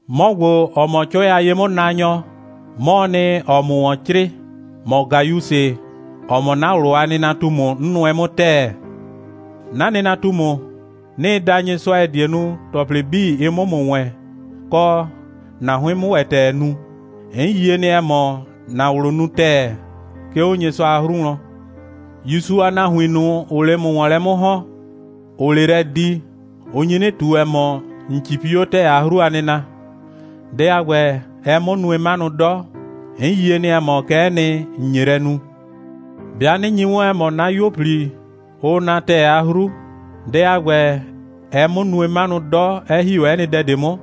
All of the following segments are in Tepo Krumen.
'Mɔ ‑gbo, ‑ɔ mɔ 'cʋɛ a ye'mʋnaanyɔ, 'mɔɔ nɩ, ‑ɔɔ ‑mʋ ‑wɔn 'crɩɩ, ‑mɔ Gayusɩ, ‑ɔ mɔ 'na ꞊wlʋ a nɩnatumu, 'n nʋɛ 'mʋ ‑tɛɛ. 'Na nɩnatumu, 'nɩɩ da Nyɩsʋa, ‑ɛ die nu, ‑tɔplɩ 'bii, ɩ 'mʋ ‑mʋ wɛɛn, kɔ, ‑na 'hʋɩn 'mʋ ‑wɛ ‑tɛɛ nu. 'N yie nɩ, ‑ɛ mɔ, ‑na ꞊wlʋ nu ‑tɛɛ, 'ke 'o Nyɩsʋa a 'hru wlɔn. ‑Yusu a nahuin ꞊nʋ, ‑ʋʋ 'le ‑mʋ ‑wɔn lɛ 'mʋ ‑hɔn, ‑ʋʋ 'le lɛ di, ʋ nyi 'nɩ ꞊tu, ‑ɛ mɔ, ‑n 'cipi 'o ‑tɛɛ a 'hru a nɩna. Dɛ a ‑gbɛ, ɛɛ 'mʋ nue 'manʋ 'dɔ. 'N yie nɩ, ‑ɛ mɔ, kɛ'ɛ nɩ, ‑n nye lɛ nu. 'Bɩa 'nɩ nyi 'wɔn, ‑ɛ mɔ, 'na 'yuo꞊pli, ʋʋ na ‑tɛɛ a 'hru, dɛ a ‑gbɛ, ɛɛ 'mʋ nue 'manʋ 'dɔ, 'ɛ ‑hi 'o 'ɛ nɩ dɛ ꞊de 'mʋ.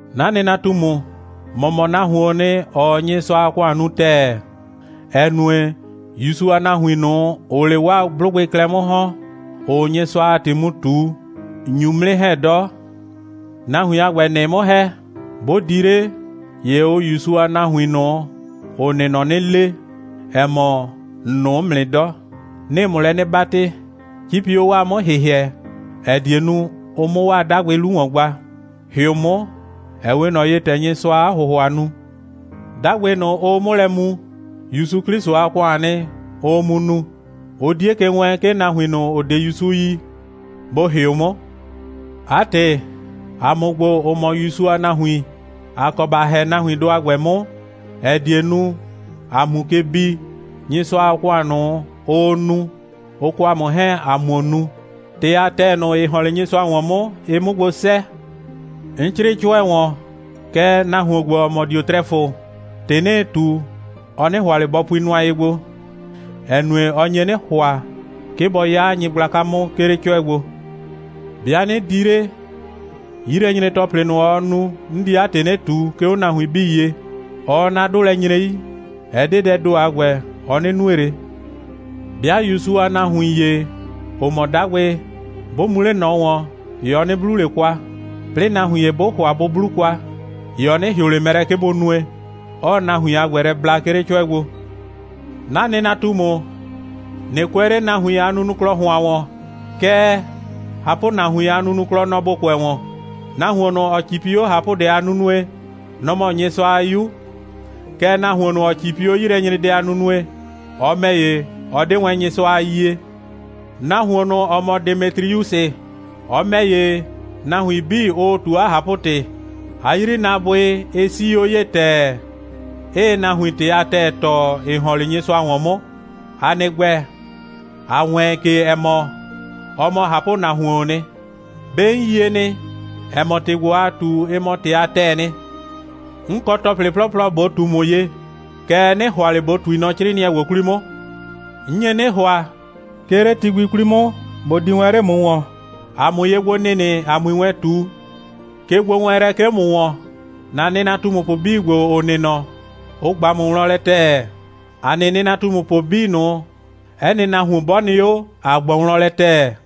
'Na nɩnatumu, ‑mɔ mɔ nahuoon nɩ, ‑ɔɔ Nyɩsʋa a ‑kʋan nu ‑tɛɛ, ‑ɛ nue, ‑Yusu a nahuin ꞊nʋ, ‑ʋʋ 'le 'waa 'blʋgbɩ klɛ 'mʋ ‑hɔn, ‑ʋʋ Nyɩsʋa a ‑tɩ mu ꞊tu, ‑n nyu 'mʋ 'nɩ ‑hɛ 'dɔ. Nahuin a ‑gbɛ, ‑nɩɩ 'mʋ ‑hɛ, 'bʋ di 'le, ‑ye ʋʋ ‑Yusu a nahuin ꞊nʋ, ‑ʋ nɩ nɔ 'nɩ le, ‑ɛ mɔ, ‑n nʋʋ 'mʋ nɩ 'dɔ. 'Nɩɩ ‑mʋ lɛ 'nɩ 'batɩ, 'cipi 'o 'waa 'mʋ‑hɩhɩɛ, ‑ɛ die nu, ʋ 'mʋ 'waa 'dagbɩ 'lu ‑wɔn gba. ‑Hɩʋ 'mʋ, ‑ɛ 'we ꞊nɔ ye, ‑tɛ Nyɩsʋaa 'a ‑hʋhʋa nu. 'Dagbɩ ꞊nʋ, ʋʋ 'mʋ lɛ mu, ‑Yusu 'Klɩsʋ a ‑kʋaan nɩ, ʋʋ mu nu. Ʋ 'die ke wɛɛn, 'ke nahuin ꞊nʋ, ‑ʋ 'de ‑Yusu yi, bʋ ‑hɩʋ 'mʋ. 'A ‑tɩ, ‑a mʋ ‑gbo, ‑ʋ mɔ ‑Yusu a nahuin, ‑a kɔ ‑ba ‑hɛ nahuindʋ a ‑gbɛ 'mʋ, ‑ɛ die nu, ‑a 'mu ke bi, Nyɩsʋa a ‑kʋan ꞊nʋ, ʋʋ nu, ʋ kɔ ‑a mʋ 'hɛɛn, ‑a 'muo nu, ‑tɩ a ‑tɛɛ ꞊nʋ, ‑ɩ ‑hɔn 'le Nyɩsʋa ‑wɔn 'mʋ, ɩ 'mʋ gbo 'sɛɛ. 'N 'crɩɩ 'cʋɛ ‑wɔn, kɛɛ, nahuon ‑gbo, ‑ɔ mɔ Diotrɛfʋ, ‑tɩ 'nɩɩ ꞊tu, ɔ 'nɩ ‑hʋa ꞊le bɔ pui nʋa ye gbo, ‑ɛ nue, ɔ nye 'nɩ ‑hʋa, 'ke bɔ 'ya nyɩgblaka 'mʋ, 'ke 'le 'cʋɛ gbo. 'Bɩa 'nɩ di 'le, 'yilɛnyre‑tɔplɩ ꞊nʋ, ɔɔ nu, 'n di 'a ‑tɩ 'nɩ ꞊tu, 'ke 'o nahuin 'bii ye. Ɔɔ 'na 'dʋ lɛ nyre 'yi. Ɛ 'de dɛɛ ‑do a ‑gbɛ, ɔ 'nɩ nue ꞊le. 'Bɩa ‑Yusu a nahuin ‑ye, ‑ʋ mɔ 'dagbɩ, 'bʋ mu 'le ꞊nɔ ‑wɔn, ‑ye ɔ 'nɩ 'blu ꞊le kwa, 'plɩɩ nahuin ‑ye 'bʋ ‑hʋa bʋ 'blu kwa, ‑ye ɔ 'nɩ ‑hɩʋ ꞊le mɛ lɛ, 'ke bʋ nue, 'ɔɔ nahuin a ‑gbɛ lɛ bla, 'ke 'le 'cʋɛ gbo. 'Na nɩnatumu, ꞊nɩ kʋɛ 'le nahuin a nunuklɔ ‑hʋan ‑wɔn, kɛɛ, ꞊hapʋnahuin a nunuklɔ, nɔ‑ ‑bo kʋɛ ‑wɔn. Nahuon ꞊nʋ, ‑ɔ 'cipi 'o ꞊hapʋdɛ a nunue, nɔ‑ mɔ Nyɩsʋa a 'yu. Kɛɛ, nahuon ꞊nʋ, ‑ɔ 'cipi 'o 'yilɛnyredɛ a nunue, ɔ ‑mɛ ‑ye, ɔ 'de wɛn Nyɩsʋa a yie. Nahuon ꞊nʋ, ‑ɔ mɔ Demetriusɩ, ɔ ‑mɛ ‑ye, nahuin 'bii, ʋʋ ꞊tu 'a ꞊hapʋ‑tɩ. 'A 'yrinaabʋɩ, ɩ 'sii 'o ye ‑tɛɛ, 'ɩɩ nahuin ‑tɩ a ‑tɛɛ tɔɔ, ‑ɩ ‑hɔn 'le Nyɩsʋa ‑wɔn 'mʋ. ‑A nɩ ‑gbɛ, ‑a wɛɛn ke, ‑ɛ mɔ, ɔ mɔ ꞊hapʋnahuoon nɩ. 'Be ‑n yie nɩ, ‑ɛ mɔ, ‑tɩ ‑gbo, ‑aa ꞊tu, ɩ mɔ ‑tɩ a ‑tɛɛ nɩ. 'N kɔ ‑tɔplɩ 'plɔplɔ ꞊bo ꞊tu ‑mʋ ye, kɛɛ, 'nɩ ‑hʋa ꞊le ꞊bo ꞊tui nɔ 'crɩɩnɩɛ ‑gbo 'kwli 'mʋ. 'N nye 'nɩ ‑hʋa, 'ke 'le ti gbi 'kwli 'mʋ, ꞊bo di wɛn 'le ‑mʋ ‑wɔn, ‑a 'mʋ ye gbo nɩnɩ, ‑a 'mui wɛn ꞊tu. Kegbowɛɛnlɛ 'ke 'o ‑mʋ ‑wɔn. ‑Na nɩnatumupʋ 'bii ‑gbo, ‑ʋ nɩ nɔ, ʋ ꞊gba ‑mʋ wlɔn lɛ ‑tɛɛ. ‑A nɩ nɩnatumupʋ 'bii ꞊nʋ, 'ɛ nɩ nahuon 'bɔ nɩ 'o, ‑a ꞊gbɔ wlɔn lɛ ‑tɛɛ.